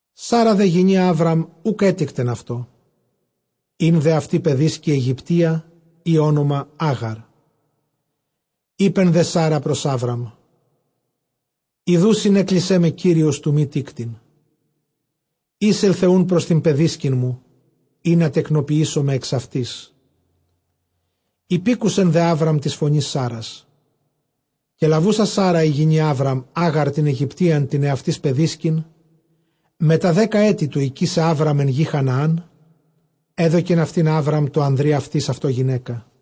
Σάρα δὲ ἡ γυνὴ Ἅβραμ οὐκ ἔτικτεν αὐτῷ· ἦν δὲ αὐτῇ παιδίσκη Αἰγυπτία, ᾗ ὄνομα Ἄγαρ. Εἶπε δὲ Σάρα πρὸς Ἅβραμ, ἰδοὺ συνέκλεισέ με Κύριος τοῦ μὴ τίκτειν· εἴσελθε οὖν πρὸς τὴν παιδίσκην μου, ἵνα τεκνοποιήσωμαι ἐξ αὐτῆς· ὑπήκουσελ δὲ Ἅβραμ τῆς φωνῆς Σάρας. Καὶ λαβοῦσα Σάρα ἡ γυνὴ Ἅβραμ Ἄγαρ τὴν Αἰγυπτίαν τὴν ἑαυτῆς παιδίσκην, μετὰ δέκα ἔτη τοῦ οἰκῆσαι Ἅβραμ ἐν γῇ Χαναὰν, ἔδωκεν αὐτὴν τῷ Ἅβραμ ἀνδρὶ αὐτῆς αὐτῷ γυναῖκα.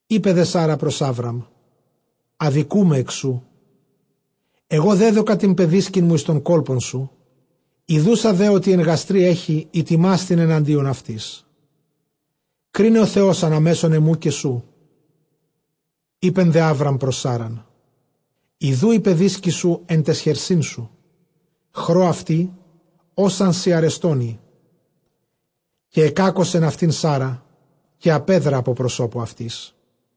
Εἶπε δὲ Σάρα πρὸς Ἅβραμ, ἀδικοῦμαι ἐκ σοῦ· ἐγὼ δέδωκα τὴν παιδίσκην μου εἰς τὸν κόλπον σου, ἰδοῦσα δὲ ὅτι ἐν γαστρὶ ἔχει, ἠτιμάσθην ἐναντίον αὐτῆς. κρίναι ὁ Θεὸς ἀνὰ μέσον ἐμοῦ καὶ σου. Εἶπε δὲ Ἅβραμ πρὸς Σάραν, ἰδοὺ ἡ παιδίσκη σου ἐν ταῖς χερσί σου, χρῶ αὐτῇ ὡς ἄν σοι ἀρεστὸν ᾖ. καὶ ἐκάκωσεν αὐτὴν Σάρα, καὶ ἀπέδρα ἀπὸ προσώπου αὐτῆς.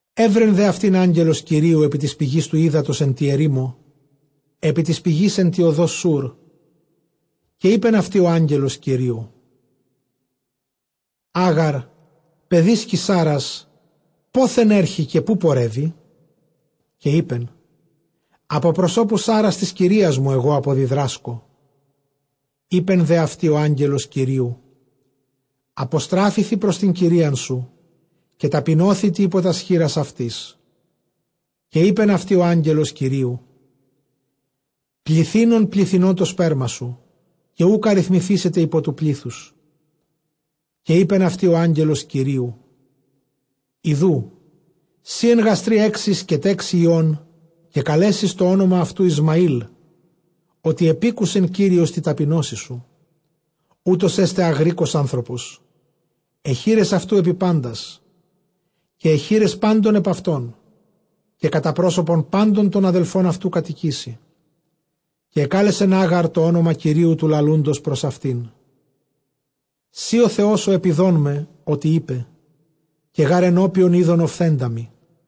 Εὗρε δὲ αὐτὴν ἄγγελος Κυρίου ἐπὶ τῆς πηγῆς τοῦ ὕδατος ἐν τῇ ἐρήμῳ, ἐπὶ τῆς πηγῆς ἐν τῇ ὁδῷ Σούρ. Καὶ εἶπεν αὐτῇ ὁ ἄγγελος Κυρίου, Ἄγαρ παιδίσκη Σάρας, πόθεν ἔρχῃ; καὶ ποῦ πορεύῃ; καὶ εἶπεν· ἀπὸ προσώπου Σάρας τῆς κυρίας μου ἐγὼ ἀποδιδράσκω. Εἶπε δὲ αὐτῇ ὁ ἄγγελος Κυρίου, ἀποστράφηθι πρὸς τὴν κυρίαν σου, καὶ ταπεινώθητι ὑπὸ τὰς χεῖρας αὐτῆς. Καὶ εἶπεν αὐτῇ ὁ ἄγγελος Κυρίου, πληθύνων πληθυνῶ τὸ σπέρμα σου, καὶ οὐκ ἀριθμηθήσεται ὑπὸ τοῦ πλήθους. Καὶ εἶπεν αὐτῇ ὁ ἄγγελος Κυρίου, ἰδοὺ σὺ ἐν γαστρὶ ἔχεις, καὶ τέξῃ υἱὸν, καὶ καλέσεις τὸ ὄνομα αὐτοῦ Ἰσμαὴλ, ὅτι ἐπήκουσε Κύριος τῇ ταπεινώσει σου. Οὗτος ἔσται ἄγροικος ἄνθρωπος· αἱ χεῖρες αὐτοῦ ἐπὶ πάντας, καὶ αἱ χεῖρες πάντων ἐπʼ αὐτόν· καὶ κατὰ πρόσωπον πάντων τῶν ἀδελφῶν αὐτοῦ κατοικήσει. Καὶ ἐκάλεσε τὸ ὄνομα Κυρίου τοῦ λαλοῦντος πρὸς αὐτὴν, σὺ ὁ Θεὸς ὁ ἐτιδών με· ὅτι εἶπε, καὶ γὰρ ἐνώπιον εἶδον ὀφθέντα μοι.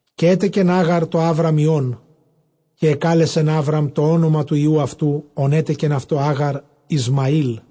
Καὶ ἔτεκεν Ἄγαρ τῷ Ἅβραμ υἱὸν, καὶ ἐκάλεσεν Ἅβραμ τὸ ὄνομα τοῦ υἱοῦ αὐτοῦ, ὃν ἔτεκεν αὐτῷ Ἄγαρ, Ἰσμαήλ.